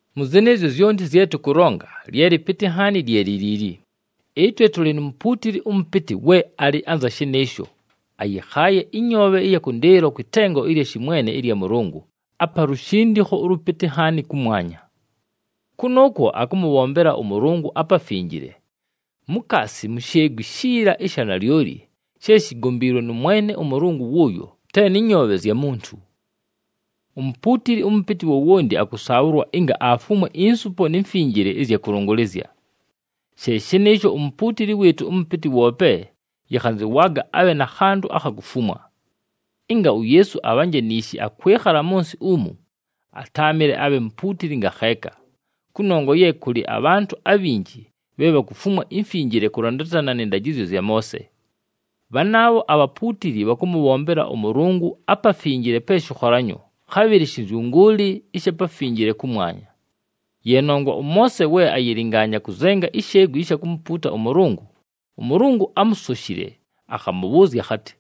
Mʉ zɨnɨɨzyo zyonti zye tʉkʉlonga, lye lɨpɨtɨ nhaani lye li liili: ɨtwe tʉlɨ nu mupuutili ʉmʉpɨtɨ we alɨ anza shɨnɨɨsho, ayɨkhaaye ɨnyoobhe ɨya kʉndɨɨlo kwɨ tengo ɨlya shɨmwene ɨlya Mʉlʉngʉ, apa lushindikho ʉlʉpɨtɨ nhaani kʉmwanya. Kʉnʉʉkwo akʉmʉbhombela ʉMʉlʉngʉ aPafinjile, mukaasi mu sheegwi shiila ɨsha nalyoli she shigombiilwe nʉ Mwene ʉMʉlʉngʉ wʉʉyo, te nɨ nyoobhe zya muntu. Umupuutili ʉmʉpɨtɨ wowonti akʉsaabhʉlwa ɨnga afumwe insupo ni mfinjile ɨzya kʉlʉngʉlɨzya. She shɨnɨɨsho, umupuutili wɨɨtʉ ʉmʉpɨtɨ woope yɨkhanzɨwaaga abhe na khantʉ akha kufumwa. Ɨnga uYeesu abhanje niishi akwɨkhala mʉ nsɨ umu, atáamɨle abhe mupuutili ngakheeka, kʉnongwa ye kʉlɨ abhantʉ abhanjɨ bhe bhakufumwa imfinjile kʉlandatana nɨ ndajɨzyo zya Moose. Bhanaabho abhapuutili bhakʉmʉbhombela ʉMʉlʉngʉ aPafinjile pe shɨkholanyo, khabhɨlɨ shɨnzyʉngʉʉlɨ ɨsha pafinjile kʉmwanya. Ye nongwa ʉMoose we ayɨlɨngaanya kʉzenga isheegwi ɨsha kumupuuta ʉMʉlʉngʉ, ʉMʉlʉngʉ ámusoshile akhamʉbhʉʉzya akhatɨ,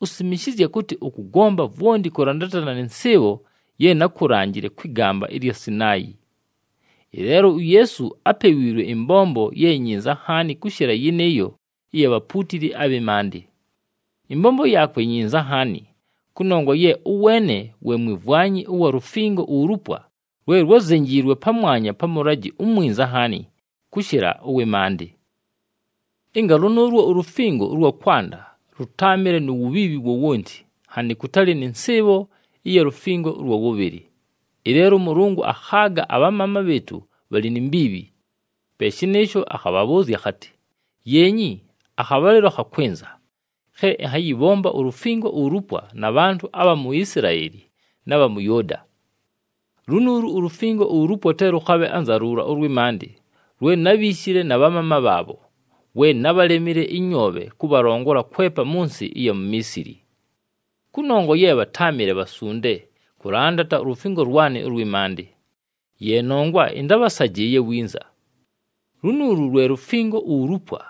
“Usimishizye kʉtɨ ʉkʉgomba vwonti kʉlandatana nɨ nsɨɨbho ye nákulanjile kwɨ gamba ɨlya Sinaayi.” Ɨleelo uYeesu apewiilwe ɨmbombo ye nyinza nhaani kʉshɨla yɨnɨɨyo ɨya bhapuutili abhɨ maandɨ. Ɨmbombo yaakwe nyinza nhaani kʉnongwa ye ʉweene we mwimvwanyi ʉwa lufingo ulupwa lwe lwázenjiilwe pamwanya pa mʉlajɨ umwinza nhaani kʉshɨla ʉwɨ maandɨ. Ɨnga lʉnʉʉlwo ulufingo ʉlwa kwanda lʉtáamɨle nu wubhiibhi wowonti, nhanɨ kʉtalɨ nɨ nsɨɨbho ɨya lufingo ʉlwa wʉbhɨlɨ. Ɨleelo ʉMʉlʉngʉ akhaaga abhamaama bhɨɨtʉ bhalɨ ni mbiibhi. Pe shɨnɨɨsho, akhabhabhʉʉzya akhatɨ, “Yeenyi, akhabhalɨlo khakwɨnza, khe ɨnhayɨbhomba ulufingo ulupwa na bhantʉ abha mu Isilaeli na bha mʉ Yʉʉda. Lunuulu ulufingo ulupwa te lʉkhabhe anza luula ʉlwɨ maandɨ lwe nábhiishile na bhamaama bhaabho, we nábhalemile ɨnyoobhe kʉbhalongola kwepa mʉ nsɨ ɨya mu Miisili. Kʉnongwa ye bhatáamɨle bhasunde kʉlandata ulufingo lwanɨ ʉlwɨ maandɨ. Ye nongwa ɨntábhasajɨɨye winza. Lunuulu lwe lufingo ulupwa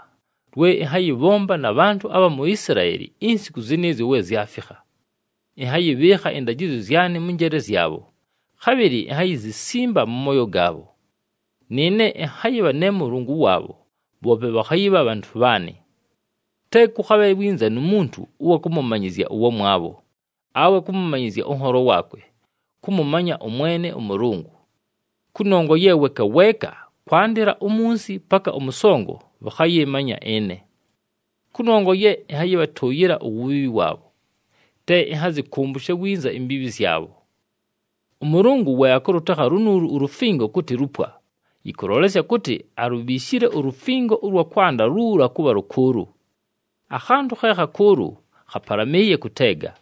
lwe ɨnhayɨbhomba na bhantʉ abha mu Isilaeli insiku zɨnɨɨzyo we zyafikha. Ɨnhayɨbhɨɨkha ɨndajɨzyo zyanɨ mʉ njeele zyabho, khabhɨlɨ inhayizisimba mʉ mooyo gaabho. Nɨɨne ɨnhayɨbha ne Mʉlʉngʉ waabho, bhoope bhakhayɨbha bhantʉ bhaanɨ. Te kʉkhabhe winza nu muntu ʉwa kʉmʉmanyɨzya ʉwamwabho, awe kʉmʉmanyɨzya ʉnholo waakwe kʉmʉmanya ʉMwene ʉMʉlʉngʉ. Kʉnongwa ye weeka weeka, kwandɨla umunsi paka ʉmʉsongo, bhakhayɨmanya ɨne. Kʉnongwa ye ɨnhayɨbhatʉʉyɨla uwubhiibhi waabho, te ɨnhazɨkʉmbʉshe winza imbiibhi zyabho.” ɄMʉlʉngʉ we akʉlʉtekha lunuulu ulufingo kʉtɨ, “lupwa,” yɨkʉlolesya kʉtɨ alubhiishile ulufingo ʉlwa kwanda luula kʉbha lʉkʉʉlʉ. Akhantʉ khe khakʉʉlʉ khapalamɨɨye kʉteega.